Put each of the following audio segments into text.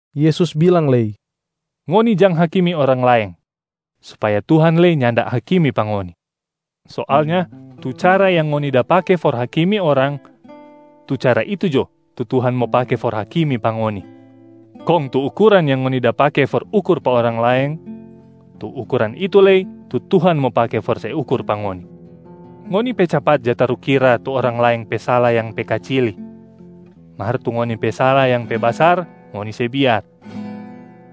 Yesus bilang lei, “Ngoni jang hakimi orang laeng, supaya Tuhan lei nyanda hakimi pa ngoni. Soalnya tu cara yang ngoni da pake for hakimi orang, tu cara itu jo tu Tuhan mo pake for hakimi pa ngoni. Kong tu ukuran yang ngoni da pake for ukur pa orang laeng, tu ukuran itu lei tu Tuhan mo pake for se ukur pa ngoni. Ngoni pe capat ja tarukira tu orang laeng pe sala yang pe kacili, mar tu ngoni pe sala yang pe basar, ngoni se biar.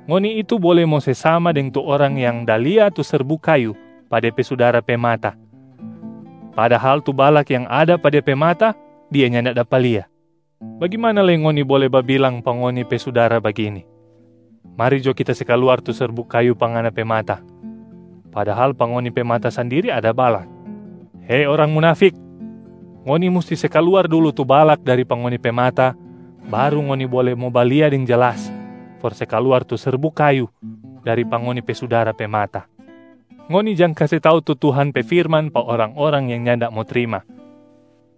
Ngoni itu bole mo se sama deng tu orang yang da lia tu serbuk kayu pa de pe sudara pe mata, padahal tu balak yang ada pa dia pe mata, dia nyanda dapa lia. Bagimana lei ngoni bole babilang pa ngoni pe sudara bagini, ‘Mari jo kita se kaluar tu serbuk kayu pa ngana pe mata,’ padahal pa ngoni pe mata sandiri ada balak. Hei orang munafik! Ngoni musti se kaluar dulu tu balak dari pa ngoni pe mata baru ngoni bole mo balia deng jelas for se kaluar tu serbuk kayu dari pa ngoni pe sudara pe mata. Ngoni jang kase tau tu Tuhan pe firman pa orang-orang yang nyanda mo trima,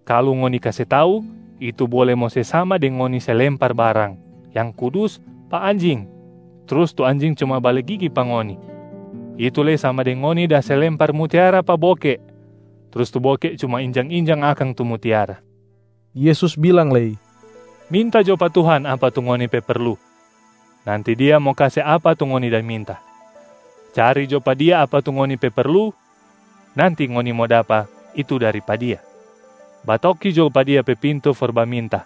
kalu ngoni kase tau itu bole mo se sama deng ngoni se lempar barang yang kudus pa anjing trus tu anjing cuma bale gigi pa ngoni. Itu lei sama deng ngoni da se lempar mutiara pa boke trus tu boke cuma injang-injang akang tu mutiara.” Yesus bilang lei, “Minta jo pa Tuhan apa tu ngoni pe perlu, nanti Dia mo kase apa tu ngoni da minta. Cari jo pa Dia apa tu ngoni pe perlu, nanti ngoni mo dapa itu dari pa Dia. Batoki jo pa Dia pe pintu for baminta,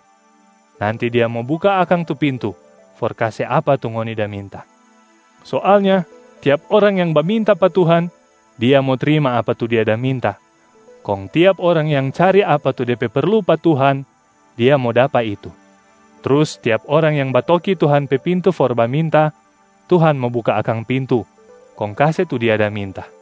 nanti Dia mo buka akang tu pintu for kase apa tu ngoni da minta. Soalnya tiap orang yang baminta pa Tuhan, dia mo trima apa tu dia da minta. Kong tiap orang yang cari apa tu de pe perlu pa Tuhan, dia mo dapa itu. Trus tiap orang yang batoki Tuhan pe pintu for baminta, Tuhan mo buka akang pintu kong kase tu dia da minta.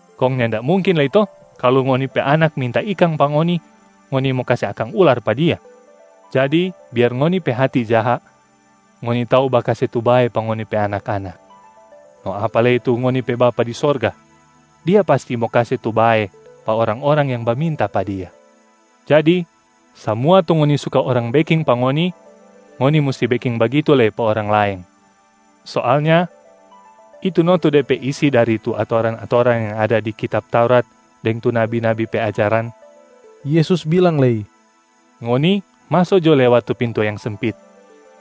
Kong nyanda mungkin lei to kalu ngoni pe anak minta ikang pa ngoni, ngoni mo kase akang ular pa dia? Jadi biar ngoni pe hati jaha, ngoni tau bakase tu bae pa ngoni pe anak-anak. No apa lei tu ngoni pe Bapa di sorga, Dia pasti mo kase tu bae pa orang-orang yang baminta pa Dia. Jadi samua tu ngoni suka orang beking pa ngoni, ngoni musti beking bagitu lei pa orang laeng. Soalnya itu no tu de pe isi dari tu atoran-atoran yang ada di kitab Taurat deng tu nabi-nabi pe ajaran.” Yesus bilang lei, “Ngoni maso jo lewat tu pintu yang sempit.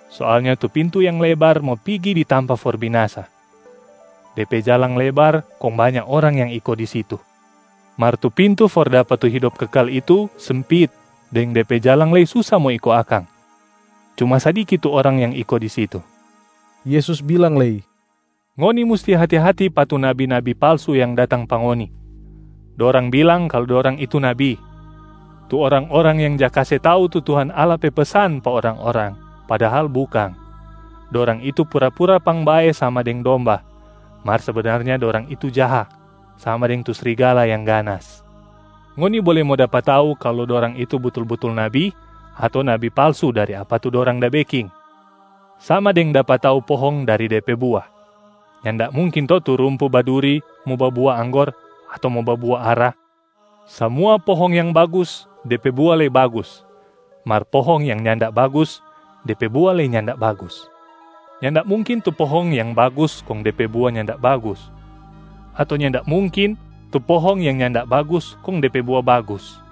Soalnya tu pintu yang lebar mo pigi di tampa for binasa, de pe jalang lebar kong banya orang yang iko di situ. Mar tu pintu for dapa tu hidop kekal itu sempit deng de pe jalang lei susa mo iko akang, cuma sadiki tu orang yang iko di situ.” Yesus bilang lei, “Ngoni musti hati-hati pa tu nabi-nabi palsu yang datang pa ngoni! Dorang bilang kalu dorang itu nabi, tu orang-orang yang ja kase tau tu Tuhan Allah pe pesan pa orang-orang padahal bukang. Dorang itu pura-pura pangbae sama deng domba, mar sebenarnya dorang itu jaha sama deng tu srigala yang ganas. Ngoni bole mo dapa tau kalu dorang itu butul-butul nabi ato nabi palsu dari apa tu dorang da beking, sama deng dapa tau pohong dari de pe bua. Nyanda mungkin to tu rumpu baduri mo babua anggor ato mo babua ara. Samua pohong yang bagus de pe bua lei bagus, mar pohong yang nyanda bagus de pe bua lei nyanda bagus. Nyanda mungkin tu pohong yang bagus kong de pe bua nyanda bagus, ato nyanda mungkin tu pohong yang nyanda bagus kong de pe bua bagus.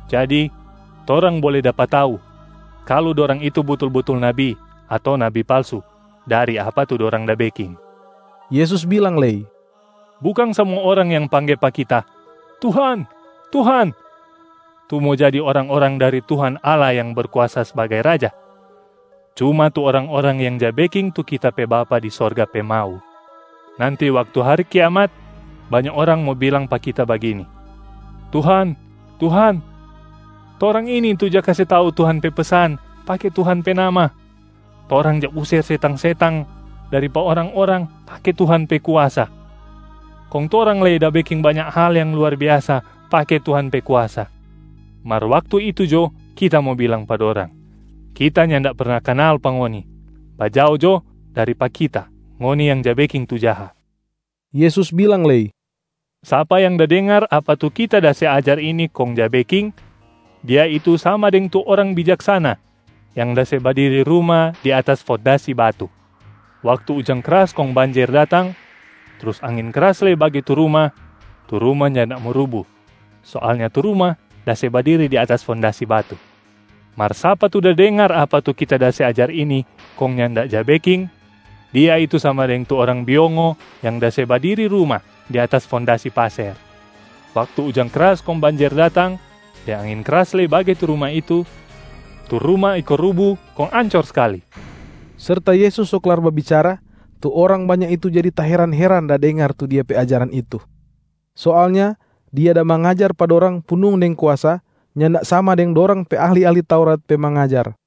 Jadi, torang bole dapa tau kalu dorang itu butul-butul nabi ato nabi palsu dari apa tu dorang da beking.” Yesus bilang lei, “Bukang samua orang yang pangge pa Kita, ‘Tuhan, Tuhan’ tu mo jadi orang-orang dari Tuhan Allah yang Berkuasa sbagai Raja, cuma tu orang-orang yang ja beking tu Kita pe Bapa di sorga pe mau. Nanti waktu hari kiamat, banya orang mo bilang pa Kita bagini, ‘Tuhan, Tuhan, torang ini tu ja kase tau Tuhan pe pesan pake Tuhan pe nama. Torang ja user setang-setang dari pa orang-orang pake Tuhan pe kuasa, kong torang lei da beking banya hal yang luar biasa pake Tuhan pe kuasa.’ Mar waktu itu jo, Kita mo bilang pa dorang, ‘Kita nyanda perna kanal pa ngoni, bajao jo dari pa Kita ngoni yang ja beking tu jaha!’” Yesus bilang lei, “Sapa yang da dengar apa tu Kita da se ajar ini kong ja beking, dia itu sama deng tu orang bijaksana yang da se badiri ruma di atas fondasi batu. Waktu ujang kras kong banjer datang, trus angin kras lei bage tu ruma, tu ruma nyanda mo rubu. Soalnya tu ruma da se badiri di atas fondasi batu. Mar sapa tu da dengar apa tu Kita da se ajar ini kong nyanda ja beking, dia itu sama deng tu orang biongo yang da se badiri ruma di atas fondasi paser. Waktu ujang kras kong banjer datang, deng angin kras lei bage tu ruma itu, tu ruma iko rubu kong ancor skali.” Serta Yesus so klar babicara, tu orang banya itu jadi taheran-heran da dengar tu Dia pe ajaran itu. Soalnya Dia da mangajar pa dorang punung deng kuasa, nyanda sama deng dorang pe ahli-ahli Taurat pe mangajar.